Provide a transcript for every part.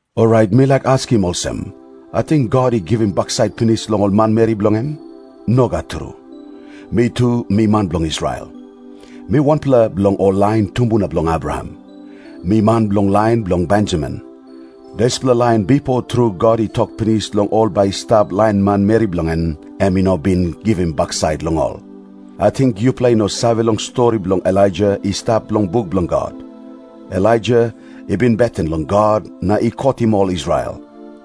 Orait mi laik askim olsem, ating God i givim baksait pinis long ol manmeri bilong en? Nogat tru. Mi tu mi man bilong Israel. Mi wanpela bilong ol lain tumbuna bilong Abraham. Mi man bilong lain bilong Benjamin. Dispela lain bipo tru God i tok pinis long ol bai i stap lain manmeri bilong en, em i no bin givim baksait long ol. Ating yupela i no save long stori bilong Elaija i stap long buk bilong God? Elaija i beten long God na i kotim ol Israel.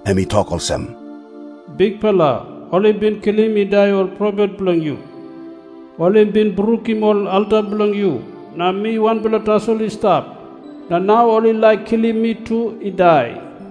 Em i tok olsem, "Bikpela, ol i bin kilim i dai ol profet bilong yu. Ol i bin brukim ol alta bilong yu. Na mi wanpela tasol i stap, na nau ol i laik kilim mi tu i dai."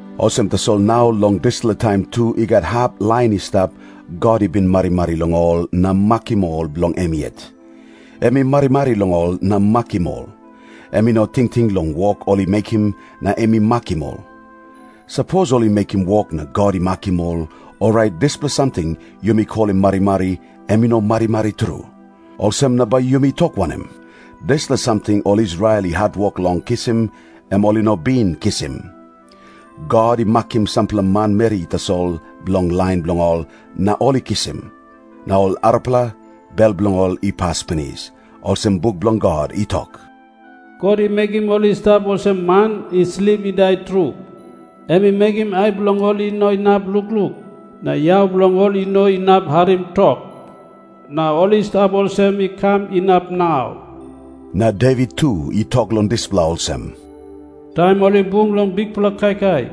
Olsem tasol nau long dispela taim tu i gat hap lain i stap, God i bin marimari long ol na makim ol bilong em yet. Em i marimari long ol na makim ol. Em i no tingting long wok ol i mekim na em i makim ol. Sapos ol i mekim wok na God i makim ol, orait dispela samting yumi kolim marimari, em i no marimari tru. Olsem na bai yumi tok wanem? Dispela samting ol Israel i hatwok long kisim, em ol i no bin kisim. God i makim sampela manmeri tasol bilong lain bilong ol, na ol i kisim. Na ol arapela, bel bilong ol i pas pinis, olsem buk bilong God i tok, "God i mekim ol i stap olsem man i slip i dai tru. Em i mekim ai bilong ol i no inap lukluk, na yau bilong ol i no inap harim tok. Na ol i stap olsem i kam inap nau." Na Devit tu i tok long dispela olsem, "Taim ol i bung long bikpela kaikai,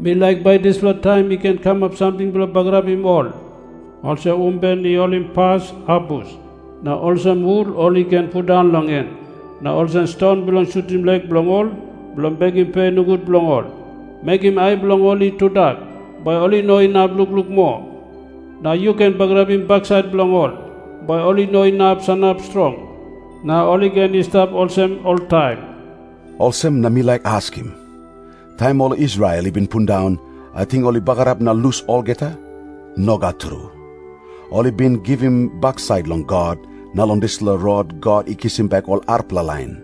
mi laik bai dispela taim i ken kamap samting bilong bagarapim ol, olsem umben i holimpas abus, na olsem hul ol i ken pundaun long en na olsem ston bilong sutim lek bilong ol, bilong bekim pe nogut long ol. Mekim ai bilong ol i tudak, bai ol i no inap lukluk moa. Na yu ken bagarapim baksait bilong ol, bai ol i no inap sanap strong. Na ol i ken i stap olsem oltaim." Olsem na mi laik askim. Taim ol Israel i bin pundaun, ating ol i bagarap na lus olgeta? Nogat tru. Ol i bin givim baksait long God, na long dispela rot God i kisim bek ol arapela lain.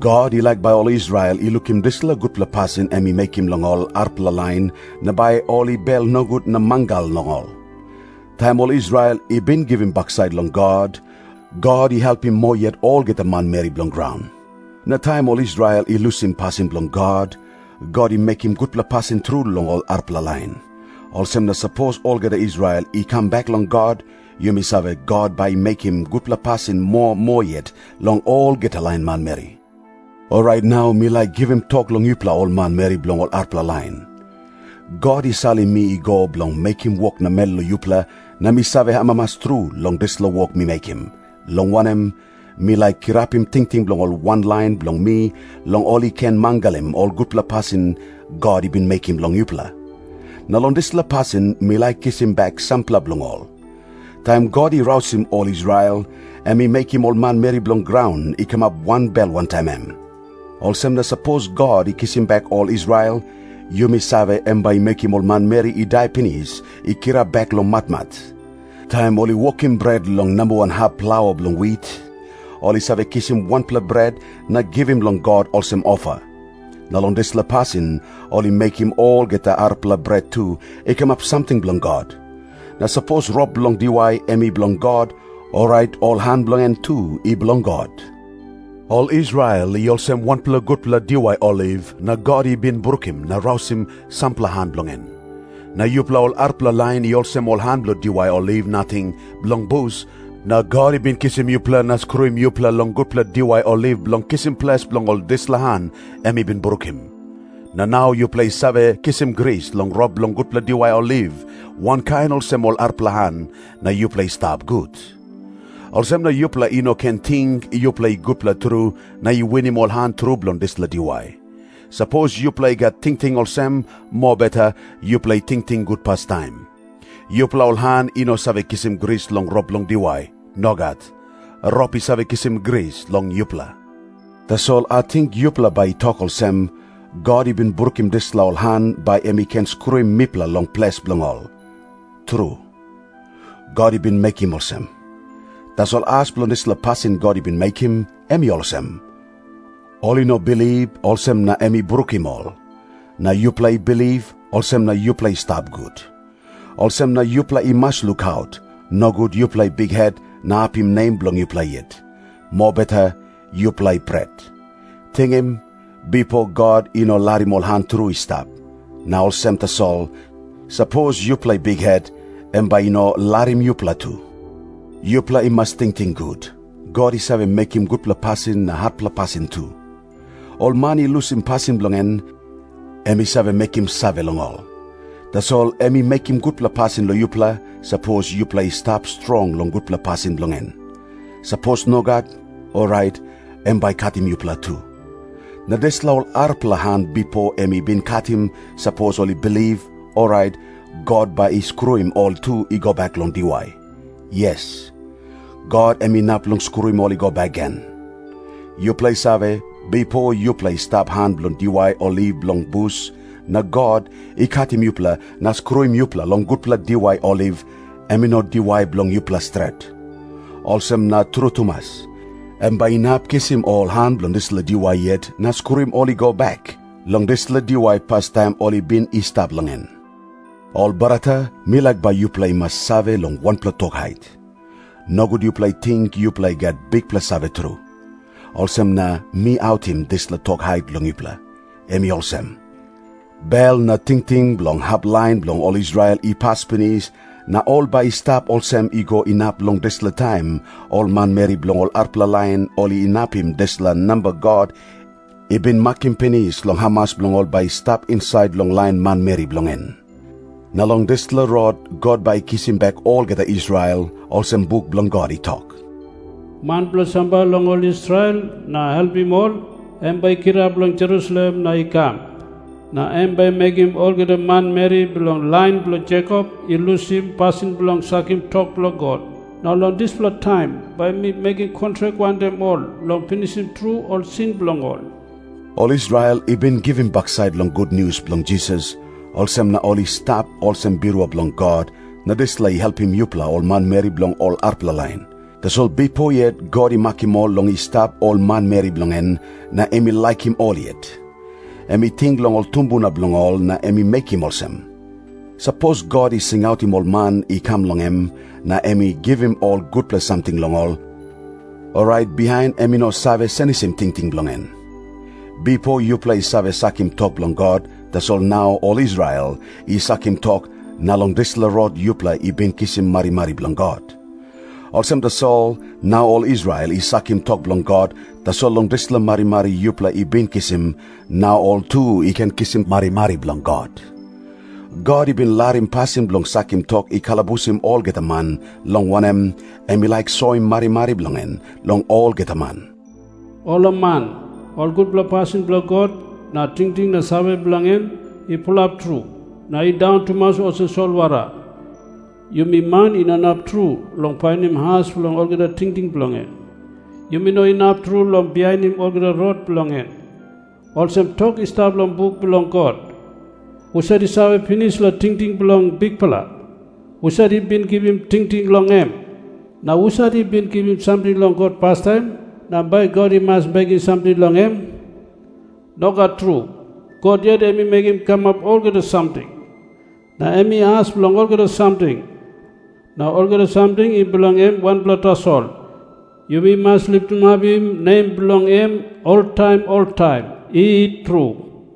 God i laik bai ol Israel i lukim dispela gutpela pasin em i mekim long ol arapela lain na bai ol i bel nogut na mangal long ol. Taim ol Israel i bin givim baksait long God, God i helpim moa yet olgeta manmeri bilong graun. Na taim ol Israel i lusim pasin bilong God, God i mekim gutpela pasin tru long ol arapela lain. Olsem na sapos olgeta Israel i kam bek long God, yumi save God bai i mekim gutpela pasin moa moa yet long olgeta lain manmeri. Orait nau mi laik givim tok long yupela ol manmeri bilong ol arapela lain. God i salim mi i go bilong mekim wok namel long yupela, na mi save amamas tru long dispela wok mi mekim, long wanem, mi laik kirapim tingting bilong ol wanlain bilong mi long ol i ken mangalim ol gutpela pasin God i bin mekim long yupela. Na long dispela pasin mi laik kisim bek sampela bilong ol. Taim God i rausim ol Israel, em i mekim ol manmeri bilong graun i kamap wanbel wantaim em. Olsem na sapos God i kisim bek ol Israel, yumi save em bai i mekim ol manmeri i dai pinis i kirap bek long matmat. Taim ol i wokim bret long namba wan hap plaua bilong wit, ol i save kisim wanpela bret na givim long God olsem ofa. Na long dispela pasin ol i mekim olgeta arapela bret tu i kamap samting bilong God. Na sapos rop bilong diwai em i bilong God, orait ol han bilong en tu i bilong God. Ol Israel i olsem wanpela gutpela diwai oliv, na God i bin brukim na rausim sampela han bilong en. Na yupela ol arapela lain i olsem ol han bilong diwai oliv nating bilong bus, na God i bin kisim yupela na skruim yupela long gutpela diwai oliv bilong kisim ples bilong ol dispela han em i bin brukim. Na nau yupela i save kisim gris long rop bilong gutpela diwai oliv wankain olsem ol arapela han, na yuplea i stap gut. Olsem na yupela i no ken ting yupela i gutpela tru na i winim ol han tru bilong dispela diwai. Sapos yupela i gat tingting olsem, mobeta yupela i tingting gut pastaim. Yupela ol han i no save givim gris long rop bilong diwai. Nogat. Rop i save givim gris long yupela. Tasol ating yupela bai i tok olsem, "God i bin brukim dispela ol han, bai em i ken skruim mipela long ples bilong ol." Tru, God i bin mekim olsem. Tasol as bilong dispela pasin God i bin mekim, em i olsem. Ol i no bilip, olsem na em i brukim ol. Na yupela i bilip, olsem na yupela i stap gut. Olsem na yupela i mas lukaut, nogut yupela i bikhet na apim nem bilong yupela yet. Mobeta yupela i pret. Tingim. Bipo, God i no larim ol han tru i stap. Na olsem tasol, sapos yupela i bikhet, em bai i no larim yupela tu. Yupela i mas tingting gut, God i save mekim gutpela pasin na hatpela pasin tu. Ol man i lusim pasin bilong en, em i save mekim save long ol. Tasol em i mekim gutpela pasin long yupela, sapos yupela i stap strong long gutpela pasin bilong en. Sapos nogat, orait em bai i katim yupela tu. Na dispela ol arapela han bipo em i bin katim, sapos ol i bilip, orait God bai i skruim ol tu i go bek long diwai. Yes, God em inap long skruim ol i go bek gen. Yupela i save, bipo yupela i stap han bilong diwai oliv bilong bus, na God i katim yupela na skruim yupela long gutpela diwai oliv, em i no diwai bilong yupela stret. Olsem na tru tumas, em bai inap kisim ol han bilong dispela diwai yet na skruim ol i go bek long dispela diwai pastaim ol i bin i stap long en. Ol brata, mi laik bai yupela i mas save long wanpela tok hait. Nogut yupela i ting yupela i gat bikpela save tru. Olsem na mi autim dispela tok hait long yupela. Em i olsem. Bel na tingting bilong hap lain bilong ol Israel i pas pinis, na ol bai i stap olsem i go inap long dispela taim ol manmeri bilong ol arapela lain ol inapim dispela namba God i bin makim pinis long hamas bilong ol bai i stap insait long lain manmeri bilong en. Na long dispela rot God bai i kisim bek olgeta Israel, olsem buk bilong God i tok, "Man bilong sambai long ol Israel na helpim ol, em bai i kirap long Jerusalem na i kam, na em bai i mekim olgeta manmeri bilong lain bilong Jekop i lusim pasin bilong sakim tok bilong God. Na long dispela taim bai mi mekim kontrak wantaim ol long pinisim tru ol sin bilong ol." Ol Israel i bin givim baksait long gutnius bilong Jisas, olsem na ol i stap olsem birua bilong God, na dispela i helpim yupela ol manmeri bilong ol arapela lain. Tasol bipo yet God i makim ol long i stap ol manmeri bilong en, na em i laikim ol yet. Em i ting long ol tumbuna bilong ol na em i mekim olsem. Sapos God i singautim ol man i kam long em, na em i givim ol gutpela samting long ol, orait bihain em i no save senisim tingting bilong en. Bipo yupela i save sakim tok bilong God, tasol nau ol Israel i sakim tok, na long dispela rot yupela i bin kisim marimari bilong God. Olsem tasol, nau ol Israel i sakim tok bilong God, tasol long dispela marimari yupela i bin kisim, nau ol tu i ken kisim marimari bilong God. God i bin larim pasin bilong sakim tok i kalabusim olgeta man, long wanem, em i laik soim marimari bilong en long olgeta man. Olaman! Ol gutpela pasin bilong God na tingting na save bilong en i pulap tru, na i daun tumas olsem solwara! Yumi man i no inap tru long painim as bilong olgeta tingting bilong en. Yumi no inap tru long bihainim olgeta rot bilong en. Olsem tok i stap long buk bilong God, "Husat i save pinis long tingting bilong Bikpela? Husat i bin givim tingting long em?" Na "husat i bin givim samting long God pastaim na bai God i mas bekim samting long em?" Nogat tru. God yet i mekim kamap olgeta samting, na em i as bilong olgeta samting. Na olgeta samting i bilong em wanpela tasol. Yumi mas litimapim nem bilong em oltaim oltaim. I tru.